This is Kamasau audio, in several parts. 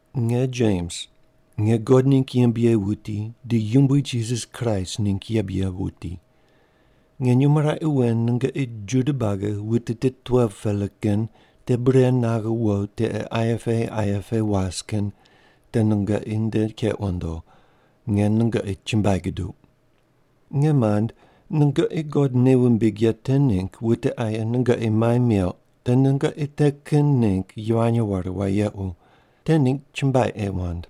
Nge Jems, nge God ningg yembe ye wuti di Yumbui Jisas Kraist ningg yembe ye wuti. Nge nyumo raqe wen nungoqi Juda buagi wute tit 12-pela kin te bure naghe wo tiqe aye pe aye pe was kin te nungoqi nde keq wundo. Nge nungoqi chumbuai guduq. Nge mand, nungoqi God nei wumbig ye te ningg wute aye nungoqi mai meuq te nungoqi te kin ningg yivany ware wayequ, te ningg chumbuai ei wand.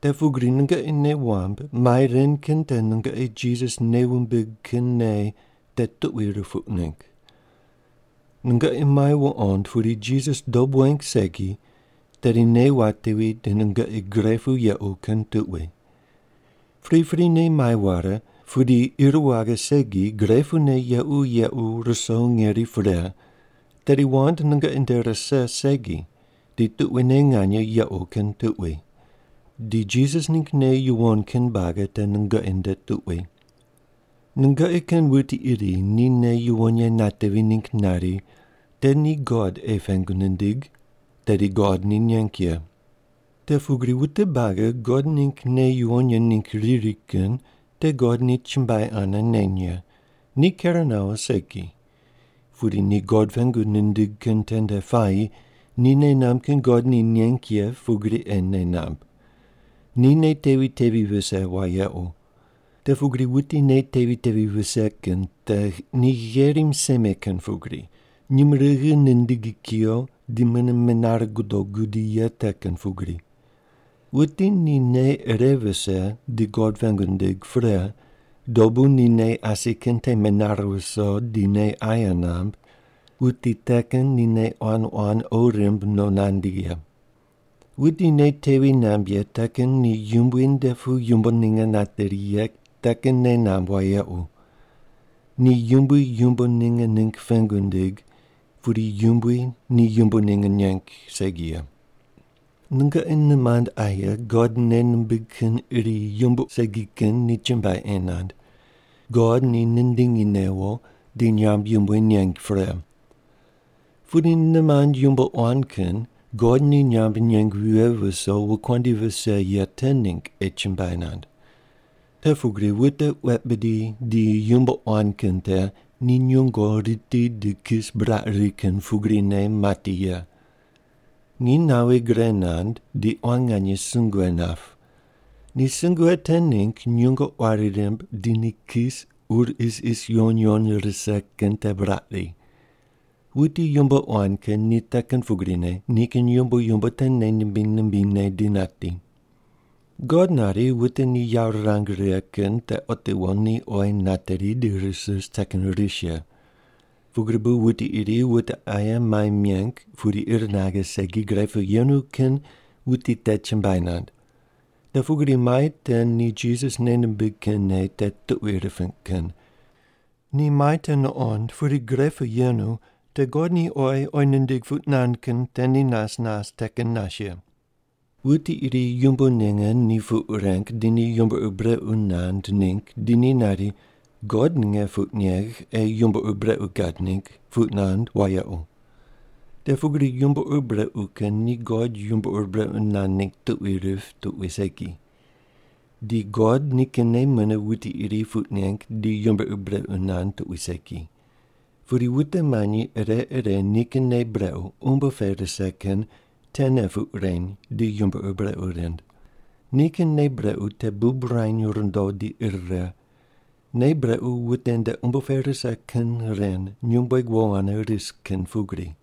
Te pugri nungoqi nei wamb mai ren kin te nungoqi Jisas nei wumbig kin nei te tuqui rupuq ningg. Nungoqi mai wuqond pudi Jisas dob weng segi, tedi nei watevi di nungoqi gre pu yequ kin tuqui. Priprine mai ware pudi ir waghe segi gre pune yequ yequ ruso ngeri pre, tedi wand nungoqi nde rise segi di tuquine nganye yequ kin tuqui. Di Jisas ningg nei yuwon kin buagi te nungoqi nde tuqui. Nungoqi kin wuti iri ni nei yuwon ye natevi ningg nari te ni God ei pengu nindig, tedi God ni neng ye. Te pugri wute buagi God ningg nei yuwon ye ningg riri kin te God ni chumbuai ane neny ye. Ni ker nawo segi. Pudi ni God pengu nindig kin tende puayi ni nei namb kin God ni neng ye pugri ei nei namb. Ni nei tevi tevi vise wayequ. Te pugri wuti nei tevi tevi vise kin te ni gherim seme kin pugri, nyumurighi nindigi kuyo di mune menare gudo gudi ye te kin pugri. Wuti ni nei ire vise di God pengu nindig pre, dobu ni nei asi kin te menare viso di nei aye namb, wuti te kin ni nei quan quan qo rimb no nandi ye. Wuti nei tevi namb ye te kin ni Yumbui nde pu yumbo ninge nateri ye te kin nei namb wayequ. Ni Yumbui yumbo ninge ningg pengu nindig, pudi Yumbui ni yumbo ninge neng segi ye. Nungoqi nimand aye God nei nimbig kin iri yumbo segi kin ni chumbuai ei nand, God ni nindingi newo, di nyamb yumbui neng pre. Pudi nimand yumbo quan kin God ni nyamb neng vighe viso wokuandi vise ye te ningg ei chumbuai nand. Te pugri wute wet bidi di yumbo quan kin te ni nyungo riti di kis buraq ri kin pugrine mati ye. Nginy nawi gre nand di quan nganye sungue nap. Ni sungue te ningg nyungo quari rimb di ni kis ur isis yuwon yuwon rise kin te buraq ri. Wuti yumbo quan kin ni te kin pugrine nikin yumbo yumbo te nei nimbiny nimbinyne di nati. God nari wute ni yawo rirang righe kin te otiwo ni oyi nateri di ris ris te kin ris ye. Pugri bu wuti iri wute aye mai meng pudi ir naghe segi gre pu yenu kin wuti te chumbuai nand. Te pugri mai te ni Jisas nei nimbig kin nei te tuqui riping kin. Ni mai te nuqond pudi gre pu yenu te God ni oyi oyi nindig puq nand kin te ni nas nas te kin nas ye. Wuti iri yumbo ninge ni puq reng di ni yumbo ur brequ nand ningg di ni nari, “God nge puq negh ei yumbo ur brequ gad ningg” puq nand wayequ. Te pugri yumbo ur brequ kin ni God yumbo ur brequ nand ningg tuqui rip tuqui segi. Di God nikinne mune wuti iri puq neng di yumbo ur brequ nand tuqui segi. Pudi wute manyi ire ire nikin nei brequ umbo pe rise kin tene puq reny di yumbo ur brequ rind. Nikin nei brequ te bub ruany rundo di ir righe. Nei brequ wute nde umbo pe rise kin ren nyumbueg wo ane ris kin pugri.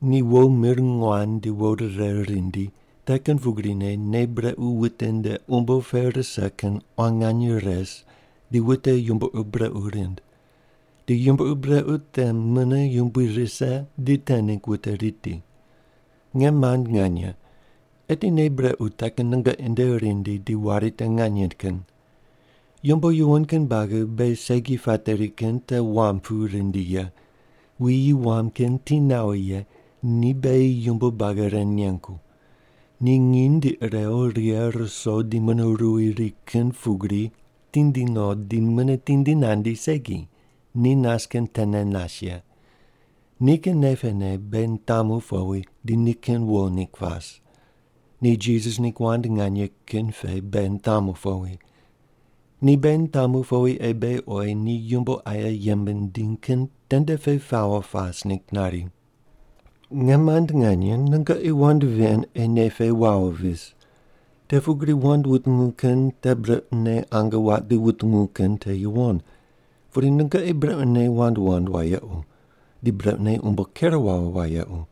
Ni wo mir nguan di wo rire rindi, te kin pugrine nei brequ wute nde umbo pe rise kin quan nganye res di wute yumbo ur brequ rind. Di yumbo ur brequ te mune yumbui rise di te ningg wute riti. Nge mand nganye, eti nei brequ te kin nungoqi nde rindi di wari te nganye kin. Yumbo yuwon kin buagi beghi segi pateri kin te wam pu rindi ye. Wuyi wam kin ti nawo ye ni beghi yumbo buagi ren nengu. Ni nginy di irew righe ruso di mune ruwi ri kin pugri tindi no di mune tindi nandi segi, ni nas kin tene nas ye. Nikin nei pene beghi nitamu powi di nikin wo ningg pas. Ni Jisas ningg wand nganye kin pe beghi nitamu powi. Ni beghi nitamu powi ei beghi oyi ni yumbo aye yembe nindiny kin tende ye pawo pas ningg nari. Nge mand nganye, nungoqi wand ven ei nei pe wawo vis. Te pugri wand wutungu kin te brequne ange waq di wutungu kin te yuwon. Pudi nungoqi brequne wand wand wayequ. Di brequne umbo ker wawo wayequ.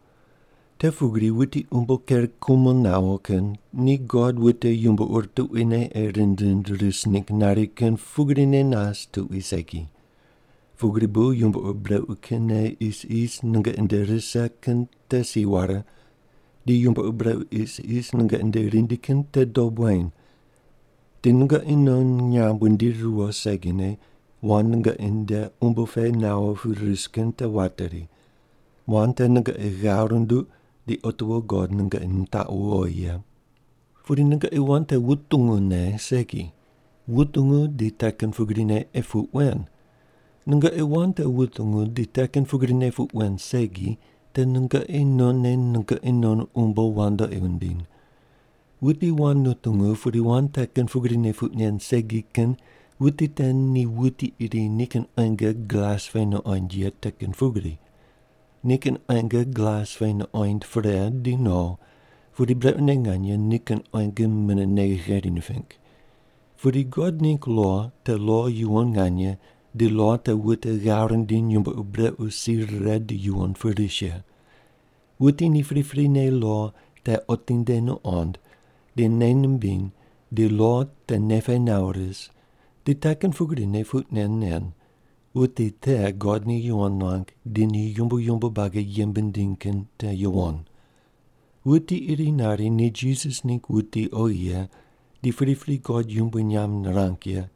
Te pugri wuti umbo ker kumo nawo kin ni God wute yumbo ur tuquine ei rind rind ris ningg nari kin pugrine nas tuqui segi. Pugri bu yumbo ur brequ kin nei isis nungoqi nde rise kin te si ware, di yumbo ur brequ isis nungoqi nde rindi kin te dob weny. Di nungoqi non nyamb wundiri riwo segine wand nungoqi nde umbo pe nawo pu ris kin te wateri. Wand te nungoqi ghav runduq di otiwo God nungoqi nitaqu wowi ye. Pudi nungoqi wand te wutungu ne segi, wutungu di te kin pugrine ei puq wen. Nungoqi wand te wutungu di te kin pugrine puq wen segi, te nungoqi nonne nungoqi non umbo wandoqi wundiny. Wuti wand nutungu pudi wand te kin pugrine puq nen segi kin wuti te ni wuti iri nikin quenge glas pe nuqoind ye te kin pugri. Nikin quenge glas pe nuqoind pre di no, pudi brequne nganye nikin quenge mune nei gheri niping. Pudi God ningg lo te lo yuwon nganye di lo te wute ghav rindiny yumbo ur brequ si rire di yuwon pu ris ye. Wuti ni priprine lo te otinde nuqond di nei nimbiny di lo te nei pe nawo ris di te kin pugrine puq nen nen, wuti te God ni yuwon nuang di ni yumbo yumbo buagi yembe nindiny kin te yuwon. Wuti iri nari ni Jisas ningg wuti oghi ye di pripri God yumbui nyamb nirang ye,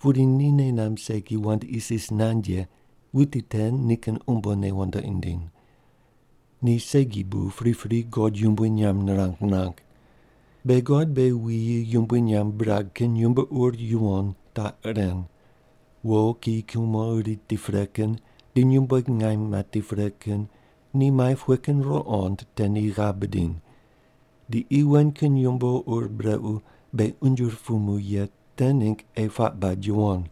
pudi ni nei namb segi wand isis nand ye wuti te nikin umbone wandoqi nindiny. Ni segi bu pripri God yumbui nyamb nirang nirang. Beghi God beghi wuyi yumbui nyamb birag kin yumbo ur yuwon taq ren: Wo kiyi kumo riti pre kin di nyumbueg ngaim mati pre kin ni mai pughe kin ruqond te ni ghav bidiny. Di qi wen kin yumbo ur brequ beghi unje rupumu ye te ningg ei puaq bad yuwon.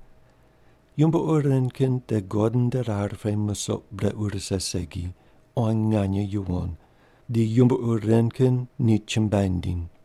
Yumbo ur ren kin te God nde rar pe musoq brequ rise segi quan nganye yuwon, di yumbo ur ren kin ni chumbuai nindiny.